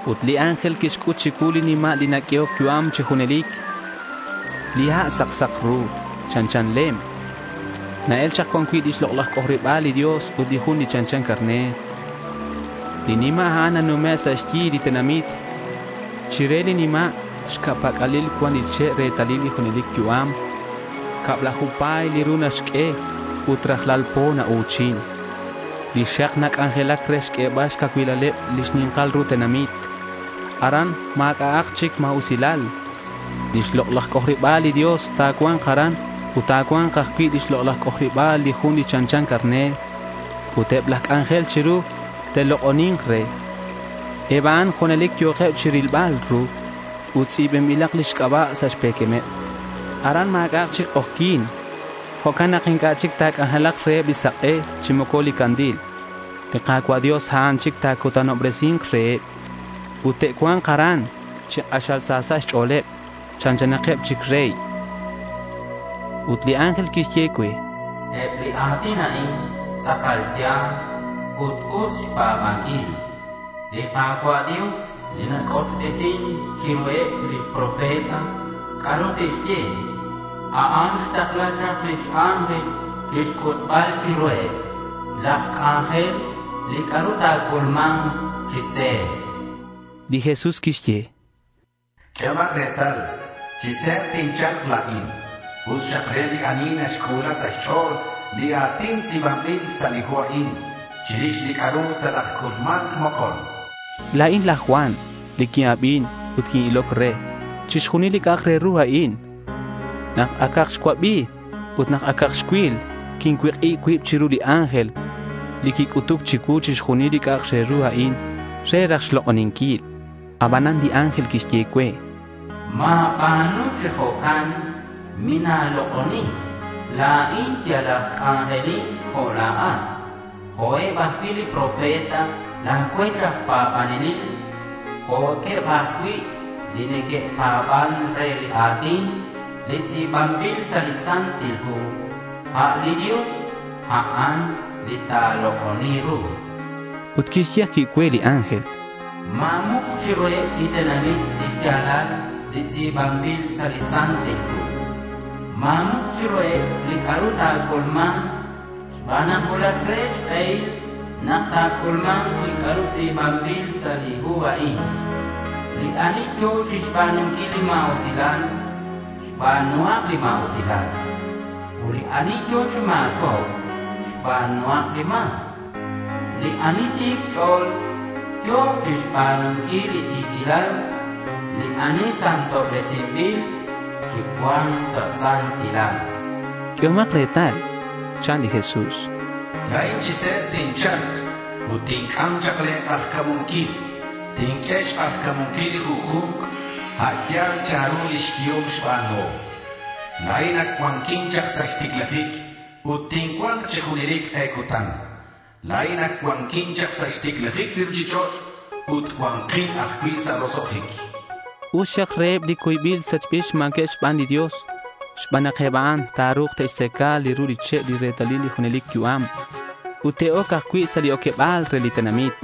Ut li ángel quixc'ut chicuu li nima' li naq'uehoc yu'am chi junelic. Li ha' sak sak ru. Chanchan lem. Na-el chak cuan cui' lix lok'laj c'ojariba̱l li Dios ut li Jun li chanchan carner. Li nima' a'an nanume' sa' xyi li tenamit. Chire li nima' xca' pac'alil cuan li che' retalil li junelic yu'am. Cablaju pa̱y li ru naxq'ue ut rajlal po nau̱chin. Lix xak nac'anjelac re xq'uebal xcacuilaleb lix ni̱nkal ru tenamit. Aran ma̱c'a'ak chic ma̱usilal. Lix lok'laj c'ojariba̱l li Dios ta̱cua̱nk aran ut ta̱cua̱nk ajcui' lix lok'laj c'ojariba̱l li Jun li chanchan carner. Ut eb laj c'anjel chiru te'lok'oni̱nk re. Eb a'an junelic yo̱keb chirilbal ru ut tz'i̱banbilak lix c'aba' sa' xpe̱quemeb. Aran ma̱c'a'ak chic k'ojyi̱n. Jo'can nak inc'a' chic ta̱c'anjelak reheb li sak'e chi moco li candil. Li Ka̱cua' Dios, a'an chic li ta̱cutanobresi̱nk reheb. Ut te'cua̱nk aran chi k'axal sa sa' xch'o̱leb. Chanchanakeb chic rey. Ut li ángel quixye cue: —Eb li a̱tin a'in tz'akal ya̱l ut us xpa̱banquil. Li Ka̱cua' Dios li nac'utbesin chiruheb lix profeta c'a'ru te'xye, a'an xtakla chak lix ángel chixc'utbal chiruheb laj c'anjel li c'a'ru ta̱c'ulma̱nk chi se̱b.— Li Jesús quixye: —Q'uehomak retal. Chi se̱b tincha̱lk la̱in. Us xak re li ani naxc'u̱la sa' xch'o̱l li a̱tin li tz'i̱banbil sa' li hu a'in chirix li c'a'ru talajc'ulma̱nk mokon, chan. La̱in laj Juan li quin-abin ut quin-iloc re chixjunil li c'a'ak re ru a'in. Nak acak xcuabi ut nak acak xcuil, quincuik'ib cuib chiru li ángel li quic'utuc chicuu chixjunil li c'a'ak re ru a'in re raj xlok'oninquil. Abanan li ángel quixye cue: —Ma̱ba̱nu chi jo'can. Mina̱lok'oni. La̱in yal aj c'anjelin jo' la̱at, jo'eb ajcui' li profeta la̱ cuech aj pa̱banelil, jo'queb ajcui' li neque'pa̱ban re li a̱tin li tz'i̱banbil sa' li hu a'in. A' li Dios, a'an li ta̱lok'oni ru, chan. Ut quixye ajcui' cue li ángel: —Ma̱muk chiruheb li tenamit li xya̱lal li tz'i̱banbil sa' li hu a'in. Ma̱muk chiruheb li c'a'ru ta̱c'ulma̱nk xban nak cuulac re xk'ehil nak ta̱c'ulma̱nk li c'a'ru tz'i̱banbil sa' li hu a'in. Li ani yo̱k chixba̱nunquil li ma̱usilal, xba̱nuhak li ma̱usilal. Ut li ani yo̱k chi ma̱cobc, xba̱nuhak li ma̱c. Li ani ti̱c xch'o̱l, yo̱k chixba̱nunquil li ti̱quilal. Li ani santobresinbil, chicua̱nk sa' santilal.— —Q'uehomak retal, chan li Jesús. —La̱in chi se̱b tincha̱lk ut tinc'am chak le̱ k'ajca̱munquil. Tinq'ue xk'ajca̱munquil li junju̱nk a' yal chanru lix yehom xba̱nuhom. La̱in li Alfa ut li Omega. La̱in ac cuanquin chak sa' xticlajic li ruchich'och' ut cua̱nkin ajcui' sa' roso'jic.— Us xak reheb li cuybil sachbil xma̱queb xban li Dios, xban nak eb a'an ta̱ru̱k te'xtzaca li ru li che' li retalil li junelic yu'am. Ut te'oc ajcui' sa' li oqueba̱l re li tenamit.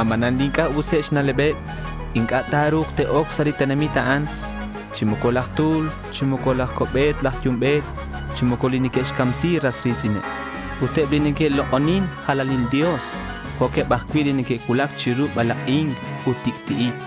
Abanan li inc'a' useb xna'leb inc'a' ta̱ru̱k te'oc sa' li tenamit a'an, chi moco laj tu̱l, chi moco laj co'bet laj yumbe̱t, chi moco li neque'xcamsi ras ri̱tz'ineb ut eb li neque'lok'onin jalanil dios jo'queb ajcui' li neque'cuulac chiru balak'ic ut tic'ti'ic.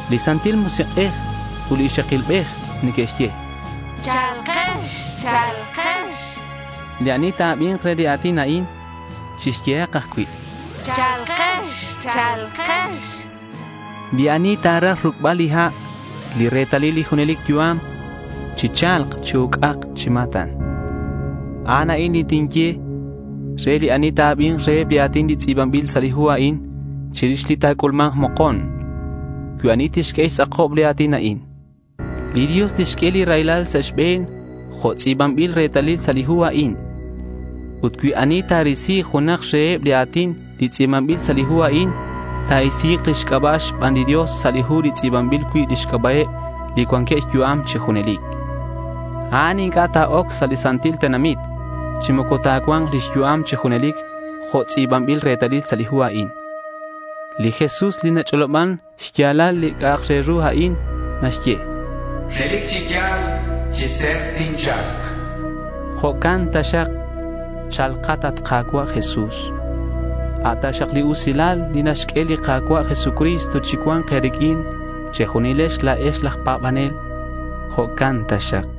Li Santil Musik'ej ut li ixakilbej neque'xye: —Cha̱lkex.— Li ani ta̱abi̱nk re li a̱tin a'in, chixyehak ajcui' —cha̱lkex.— Li ani ta̱raj ruc'bal li ha', li retalil li junelic yu'am, chicha̱lk chi uc'ac chi ma̱tan. A'an a'in li tinye re li ani ta̱abi̱nk reheb li a̱tin li tz'i̱banbil sa' li hu a'in chirix li ta̱c'ulma̱nk mokon: Cui ani tixq'ue xtz'akob li a̱tin a'in, li Dios tixq'ue li raylal sa' xbe̱n jo' tz'i̱banbil retalil sa' li hu a'in. Ut cui ani ta̱risi junak reheb li a̱tin li tz'i̱banbil sa' li hu a'in, ta̱isi̱k lix c'aba' xban li Dios sa' li hu li tz'i̱banbil cui' lix c'aba'eb li cuanqueb xyu'am chi junelic. A'an inc'a' ta̱oc sa' li santil tenamit, chi moco ta̱cua̱nk lix yu'am chi junelic jo' tz'i̱banbil retalil sa' li hu a'in. Li Jesús li nach'oloban xya̱lal li c'a'ak re ru a'in naxye: —Relic chi ya̱l chi se̱b tincha̱lk.— Jo'can taxak. Cha̱lkat, at Ka̱cua' Jesús. A' taxak li usilal li naxq'ue li Ka̱cua' Jesucristo chicua̱nk e̱riq'uin che̱junilex la̱ex laj pa̱banel. Jo'can taxak.